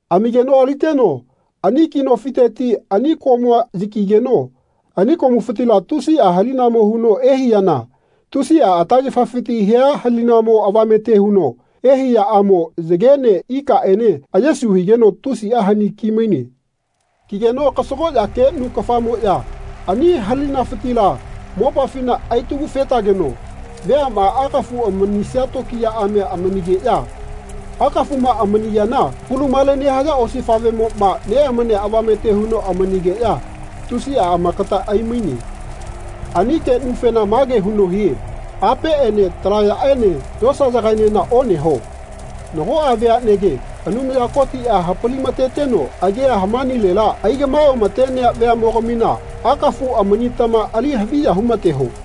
Amigeno aliteno ani ki nofiteti ani komua yakigeno ani komufitila tusiꞌa halinamo huno ehaiyana tusiꞌa atagefafiti hia halinamo avamete huno ehaiyaꞌamo yagene ikaꞌene ayesu higeno tusiꞌa hani kimaine. Kigeno kasagoꞌya keꞌnu kafamoꞌya ani halinafitila mopafina aitagu-fetageno veaꞌma akafu amanisaya tokiyaꞌamia amamigeꞌya akafuꞌma amani yana kulumale nehaya osifaꞌvemoꞌma neꞌamania avamete huno amanigeꞌya tusiꞌa amakata aimaine. Ani keꞌnufena mage huno hie “Apeꞌene talaꞌyaꞌene yosayagaenena oneho. Nagoꞌa veaꞌnege, Anumaya Kotiꞌa hapalimateteno agia hamanilela aigaꞌmae oꞌamatenea veaꞌmogamina akafu amanitama ali haviya humateho.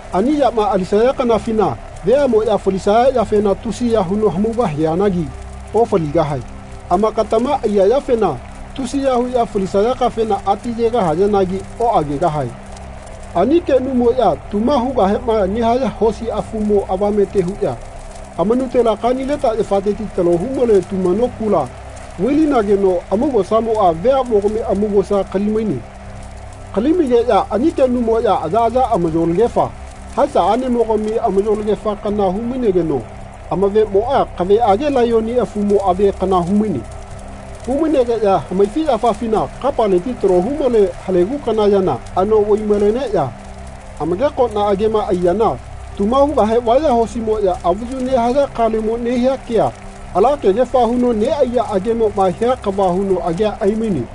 Ani yama alisaya kanafina veaꞌmoꞌya falisaya yafena tusiya huno hamaugahianagi ofaligahae. Amakatama aiya yafena tusiya huꞌya falisaya kafena ati yegahayanagi oꞌagegahae. Ani keꞌnumoꞌya tuma hugahema nehaya hosi afumo avamete huꞌya amanutela kanileta yafateti talo humale tumano kula vai-linageno amaugosamoꞌa veaꞌmogami amaugosa kali-maine. Kali-maigeꞌya ani keꞌnumoꞌya ayaꞌaya amayolagefa, haesa aꞌnemogami amayolagefa kana hu-mainegeno amaveꞌmoꞌa kaveꞌage laiyoni afumo ave kana humaine. Humainegeꞌya hamaifiꞌyafafina kapaleti talo humale halegu kana yana anoꞌvai-maleneꞌya amagekoꞌna agema aiyana tuma hugahe vaya hosimoꞌya avayu nehaya kalemo nehia kea ala kegefa huno neꞌaiya agemoꞌma hia kava huno agea aimaine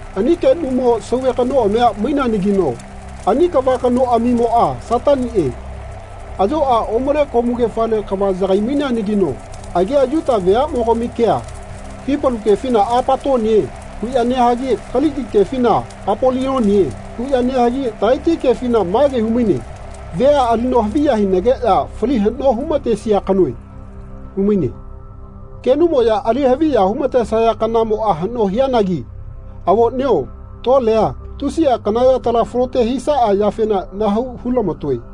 Ani keꞌnumo sauve kanoꞌamia maineanagino ani kava kanoꞌamimoꞌa Sataniꞌe, ayoꞌa omale komugefale kava yagai-maineanagino agia Yuta veaꞌmogami kea, Hipalu kefina Apatonie huꞌya nehagi Kaliki kefina Apolionie huꞌya nehagi tagaiti kefina mage humaine “Vea alino haviya hinageꞌya fali haꞌno hu-matesia kanoe.” humaine. Keꞌnumoꞌya ali haviya humatesaya kanamoꞌa haꞌno hianagi avoꞌnio tolea tusiꞌa kana yatala falote hisaꞌa yafena nahau hulamatoe.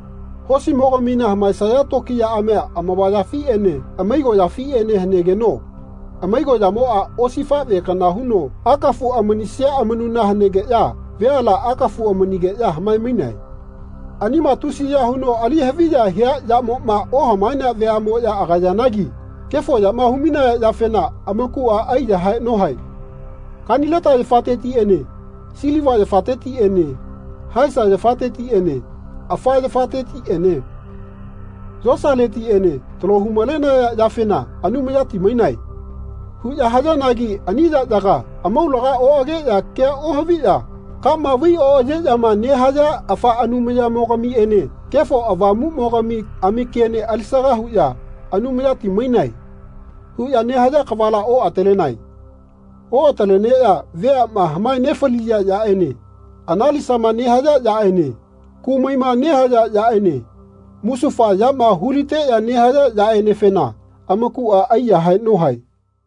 Hosimogamina hamaesaya tokiyaꞌamia amavayafiꞌene amaigoꞌyafiꞌene hanegeno amaigoꞌyamoꞌa osifaꞌve kana huno akafu amanisia amanuna hanegeꞌya veala akafu amanigeꞌya hamae-mainae. Anima tusiya huno ali haviya hia yamoꞌma ohamaenea veaꞌmoꞌya agayanagi kefo yama humainaya yafena amakuꞌa aiyahae nohae. Kanileta yafatetiꞌene siliva yafatetiꞌene haesa yafatetiꞌene afa yafatetiꞌene yosaletiꞌene talo hu-malenaya yafena “Anumayati mainae” huꞌya hayanagi ani yaꞌyaga amaulaga oꞌageꞌya kea ohaviꞌya kama vai oꞌayeꞌyama nehaya afa anumayamo-gamiene Kefo Avamuꞌmogami amakiene alisaga huꞌya “Anumayati mainae.” huꞌya nehaya kavala oꞌatalenae. Oꞌataleneꞌya veaꞌma hamae nefaliya yaꞌene analisama nehaya yaꞌene kumaima nehaya yaꞌene musufa yama hu-liteꞌya nehaya yaꞌenefena amakuꞌa aiyahae nohae.